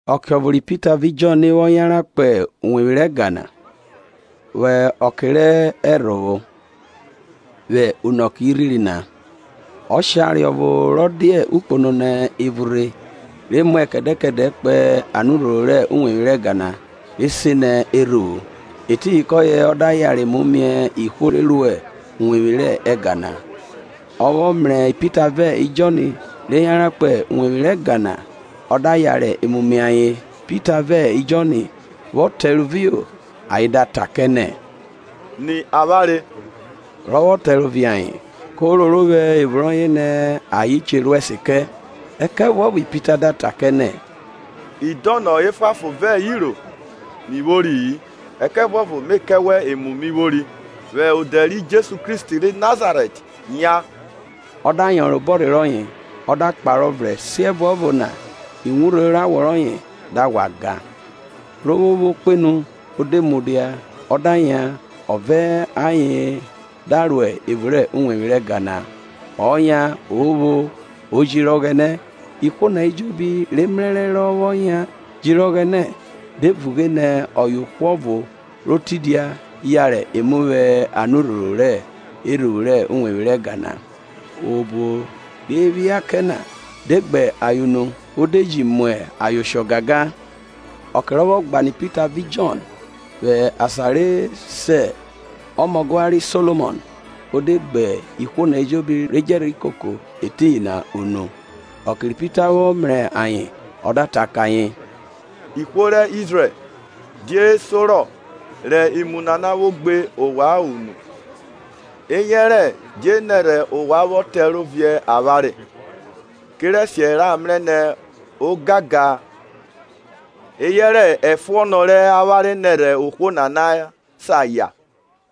Ọke ọvo ri Pita vẹ Jọn vwọ yanran kpo uwevwi rẹ ẹga na vwẹ ọke rẹ ẹrhovwo, vwẹ unọke rirhiri na. Ọshare ọvo rọ dia okpono nẹ evun rhe re muẹ kẹdẹ kẹdẹ kpo Anurhoro rẹ uwevwi rẹ ẹga na re se nẹ Erhuvwu, etiyin kọye ọ da yara emu mie ihwo re ruẹ uwevwi rẹ ẹga na. Ọ vwọ mrẹ Pita vẹ Jọn re yanran kpo uwevwi rẹ ẹga na ọ da yare emu mie ayen. Pita vẹ Jọn vwọ tẹrovio ayen da ta kẹ nẹ, Ni avwanre. Rọ vwọ tẹrovi ayen, ko roro vwẹ evun rọye nẹ ayen che ru ẹse kẹ. Ẹkẹvuọvo Pita da ta nẹ, idọnọ efuanfon vẹ iro mi vwori-i, ẹkẹvuọvo me kẹ wẹ emu mi vwori; vwẹ odẹ ri Jesu Kristi ri Nazarẹt, yan. Ọ da yọnrọn obọrhe rọye ọ da kparọ vrẹn, siẹvuọvo na iwurho rẹ awọ rọye da ghwa gan. Ro vwo pho kpenu o de mudia ọ da yan ọ vẹ ayen da ro evun rẹ uwevwi rẹ ẹga na. Ọ yan O pho O jiri Ọghẹnẹ. Ihwo na ejobi re mrẹrẹ rọ vwọ yan jiri Ọghẹnẹ, de vughe nẹ ọye ohwo ọvo ro tidia, yare emu vwẹ Anurhoro rẹ Erhuvwu rẹ uwevwi rẹ ẹga na; obo re phia kẹ na de gbe ayen unu o de ji mu ayen oshọ gangan. Ọke rọ vwọ gbanọ Pita vẹ Jọn, vwẹ asan re se ọmọgua ri Solomọn, o de gbe ihwo na ejobi re djẹ rhi koko etiyin na unu. Ọke rẹ Pita vwọ mrẹ ayen ọ da ta kẹ ayen, “Ihwo rẹ Izrẹl, die sorọ re emu nana vwo gbe ovwan unu, eyẹrẹ die nẹrhẹ ovwan vwọ tẹro viẹ avwanre kerẹsiẹ ra mrẹ nẹ ogangan eyẹrẹ ẹfuọn rẹ avwanre nerhẹ ohwo nana sa yan?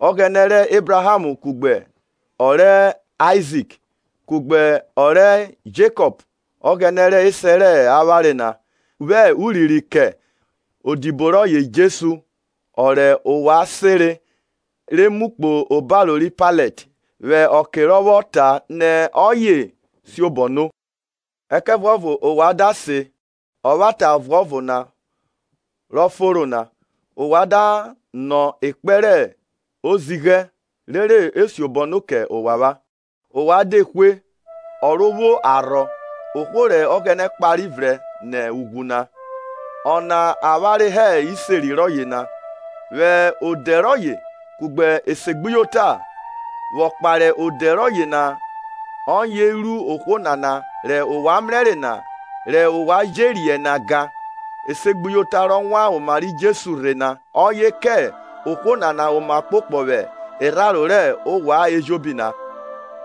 Ọghẹnẹ rẹ Ebraham kugbe ọrẹ Aizik kugbe ọrẹ Jekọp, Ọghẹnẹ rẹ esẹ rẹ avwanre na, vwẹ urinrin kẹ odibo rọye Jesu, ọ rẹ ovwan senre re mu kpo obaro ri Pailet, vwẹ ọke rọ vwọ ta nẹ ọye siobọ no. Ẹkẹvuọvo ovwan da siẹn Ọvwata Ọvuọvo na ro Fonro na, ovwan da nọ ekpẹn rẹ ozighẹ rere e siobọ no kẹ ovwan. Ovwan de hwe ọ ro vwo arhọ, ohwo rẹ Ọghẹnẹ kpare vrẹn nẹ ughwu na. Ọna avwanre hẹ iseri rọye na. Vwẹ odẹ rọye kugbe esegbuyota vwọ kpahe odẹ rọye na, ọye ru ohwo nana rẹ ovwan mrẹre na rẹ ovwan je riẹn na gan. Esegbuyota rọ wan oma ri Jesu rhe na ọye kẹ ohwo nana oma ọkpokpọ vwẹ irharo rẹ ovwan ejobi na.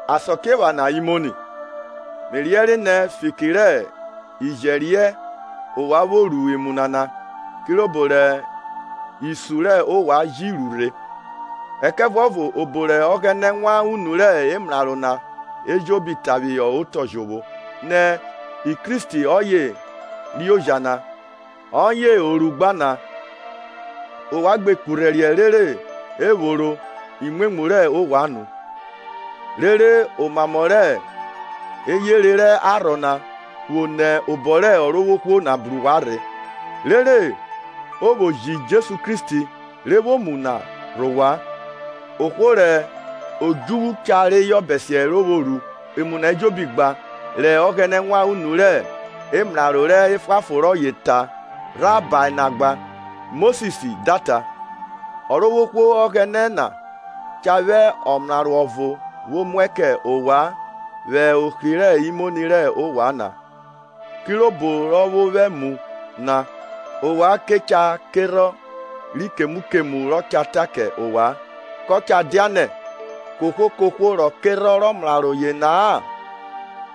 Asakiephana imoni, Me riẹnre nẹ fiki rẹ ijẹriẹn ovwan vwo ru emu nana, kirobo rẹ isun rẹ ovwan ji ru rhe. Ẹkẹvuọvo obo rẹ Ọghẹnẹ wan unu rẹ emraro na ejobi ta phihọ otọ jovwo nẹ Kristi rọye cah re oja na, ọye ọ ru gba na. Ovwan gbe kurhẹriẹ rere ephoro imwemwu rẹ ovwan nu, rere omamọ rẹ eyere rẹ arhọ na vwo nẹ obọ rẹ Ọrovwohwo na bru ovwan rhe. Rere o vwo ji Jesu Kristi re vwo mu na vwo rhe ovwan. Ohwo rẹ odjuvwu cha reyọ bẹsiẹ re vwo ru emu na ejobi gba rẹ Ọghẹnẹ wan unu rẹ emraro rẹ efuanfon rọye ta rhabae na gba. Mosis da ta, Ọrovwohwo Ọghẹnẹ na cha vwẹ ọmraro ọvo vwo muẹ kẹ ovwan vwẹ ohri rẹ imoni rẹ ovwan na kirobo rọ vwo vwẹ mu na. Ovwan ke cha kerhọn ri kemu kemu rọ cha ta kẹ ovwan. Kọ cha dia nẹ ohwo kohwo rọ kerhọn rẹ omraro yena-a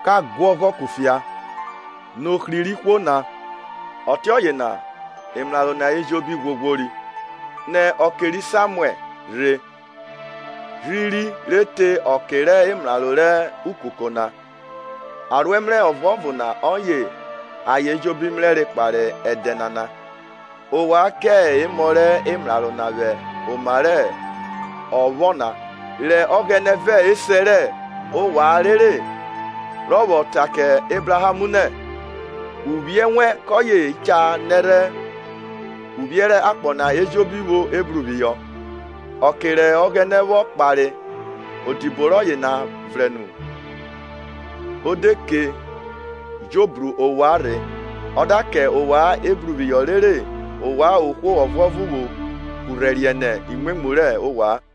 ka guọghọ kufia nẹ ohri rẹ ihwo na. Ọtiọye na emraro na ejobi ghwoghwiro, nẹ ọke ri Samuẹl rhe rhiri re te ọke rẹ emraro rẹ ukuko na, aroẹmrẹ ọvuọvo na ọye ayen ejobi mrẹre kpahe ẹdẹ nana. Ovwan ke emọ rẹ emraro na vwẹ oma rẹ ọphọ na rẹ Ọghẹnẹ vẹ esẹ rẹ ovwan rere, rọ vwọ ta kẹ Ebraham nẹ, Uvwiẹ wẹn kọye cha nẹrhẹ Uvwiẹ rẹ akpọ na ejobi vwo ebruphihọ. Ọke rẹ Ọghẹnẹ vwọ kpare odibo rọye na vrẹn nu, o de ke jo bro ovwan rhe, ọ da kẹ ovwan ebruphihọ rere ovwan ohwo ọvuọvo vwo kurhẹriẹ nẹ imwemwu rẹ ovwan.